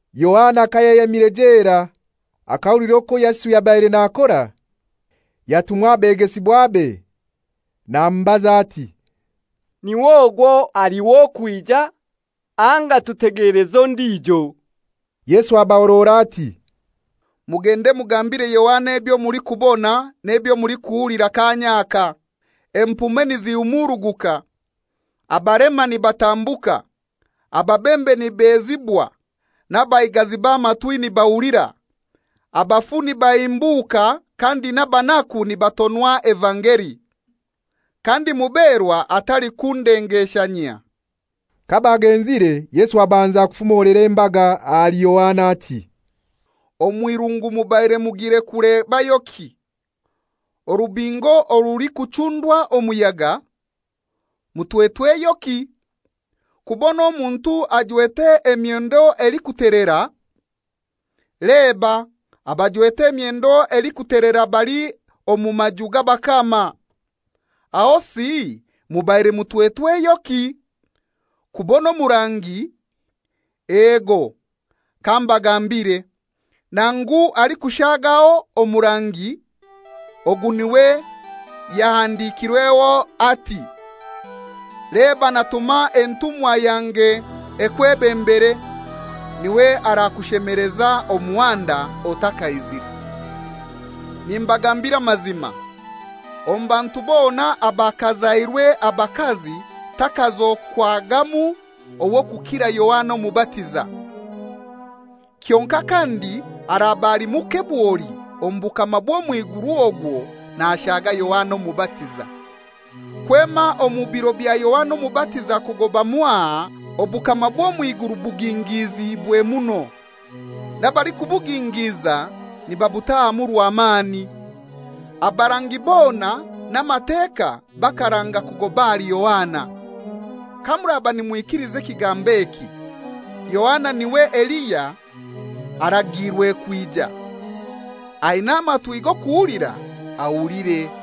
Yohana kayayemire jela akahulira okwo Yesu yabaire nakora, yatuma abegesibwabe namubaza ati, «N'iwe ogwo ali w'okwija, anga tutegeleze ondijo?» Yesu abahorora ati, «Mugende mugambire Yohana ebyo mulikubona n'ebyo mulikuhulira kaanya aka: empume nizihumuruguka, abalema nibatambuka, ababembe nibezibwa, n'abaigazi b'amatwi nibahulira, abafu nibahimbuuka kandi n'abanaku nibatonwa evangeli. Kandi muberwa atalikundengeshanyia.» Kabagenzire, Yesu abanza kufumolera embaga ahali Yohana ati, «Omw'irungu mubaire mugire kulebayoki? Orubingo orulikuchundwa omuyaga? Mutwetweyoki? Kubona omuntu ajwete emyendo elikutelera? Leba, abajwete emyendo elikutelera bali omu maju g'abakama. Ahosi mubaire mutwetweyoki? Kubona omurangi? Ego, kambagambire, nangu alikushagaho omurangi. Ogu niwe yahandikirweho ati, ‹Leba natuma entumwa yange ekwebembere, niwe arakushemeleza omuhanda otakaizire.›» «Nimbagambira amazima, omu bantu bona abakazairwe abakazi takazokwagamu ow'okukira Yohana Omubatiza; kyonkai kandi araba ali muke bwoli omu bukama bw'omw'iguru ogwo nashaga Yohana Omubatiza. Kwema omu biro bya Yohana Omubatiza kugoba mwaha obukama bw'omw'iguru bugingiziibwe muno, n'abalikubugingiiza nibabutahamu rwamani. Abarangi bona n'Amateka bakaranga kugoba ahali Yohana. Kamuraba nimwikiliza ekigambo eki, Yohana niwe Eliya aragiirwe kwija. Aina amatwi g'okuhulira ahulire.»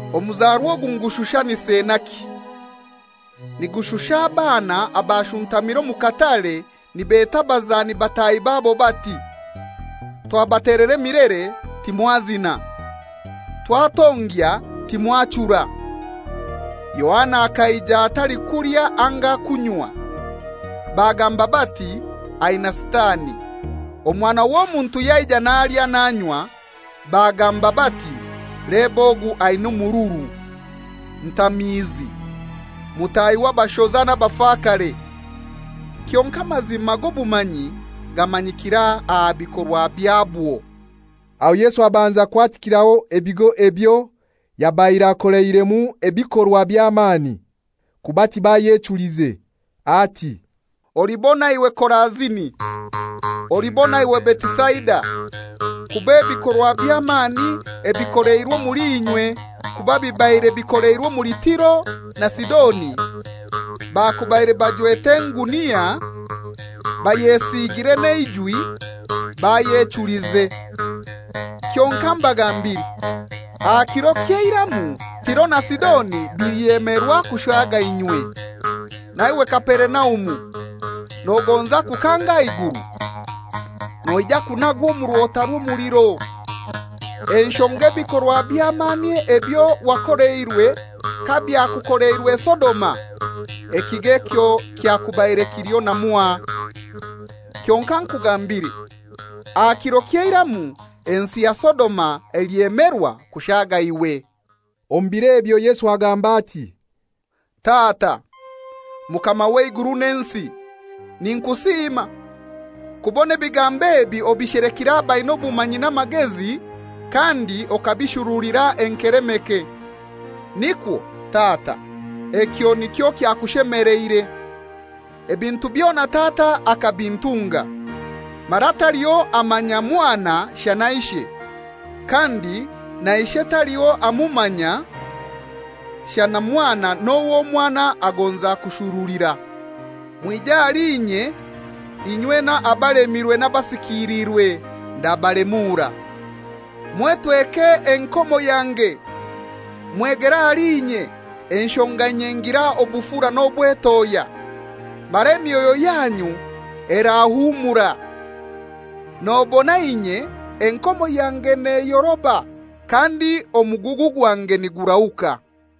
«Omuzarwa ogu ngushushanise naki? Nigushusha abaana abashuntamire omu katare nibeta abazani bataahi babo bati, ‹Twabatelera emilere, timwazina, twatongya, timwachura.›» «Yohana akaija atalikulya anga kunywa, bagamba bati, ‹Aina sitani.› Omwana w'Omuntu yaija nalya, nanywa, bagamba bati, ‹Leba ogu aina omururu, ntamiizi, mutahi w'abashoza n'abafakare!› Kyonkai amazima g'obumanyi gamanyikira aha bikorwa byabwo.» Aho Yesu abanza kwatikiraho ebigo ebyo yabaire akoleiremu ebikorwa by'amani, kuba tibayechulize, ati, «Olibona iwe Korazini! Olibona iwe Betisaida! Kuba ebikorwa by'amani ebikoleirwe omuli inywe kuba bibaire bikoleirwe omuli Tiro na Sidoni, bakubaire bajwete engunia, bayesiigire n'eijwi, bayechulize. Kyonkai mbagambire, aha kiro ky'eiramu, Tiro na Sidoni bilyemerwa kushaga inywe. Na iwe Kaperinaumu, nogonza kukanga aha iguru? Noija kunagwa omu rwota rw'omuliro. Enshonga ebikorwa by'amani ebyo wakoleirwe kabyakukoleirwe Sodoma, ekigo ekyo kyakubaire kiliho na mwaha. Kyonkai nkugambire, aha kiro ky'eiramu ensi ya Sodoma elyemerwa kushaga iwe.» Omu biro ebyo Yesu agamba ati, «Tata, Mukama w'eiguru n'ensi, ninkusiima, kubona ebigambo ebi obishelekire abaina obumanyi n'amagezi, kandi okabishurulira enkelemeke, nikwo, Tata, ekyo nikyo kyakushemeleire. Ebintu byona Tata akabintunga; mara taliho amanya Mwana shana Ishe, kandi na Ishe taliho amumanya shana Mwana n'owo Mwana agonza kushurulira. Mwije ahali inye inywena abalemirwe n'abasikiliirwe, ndabalemuura. Mwetweke enkomo yange, mwegere ahali inye, enshonga inye ngira obufura n'obwetohya, mara emyoyo yanyu erahumura. Nobona inye enkomo yange neyoroba, kandi omugugu gwange nigurahuka.»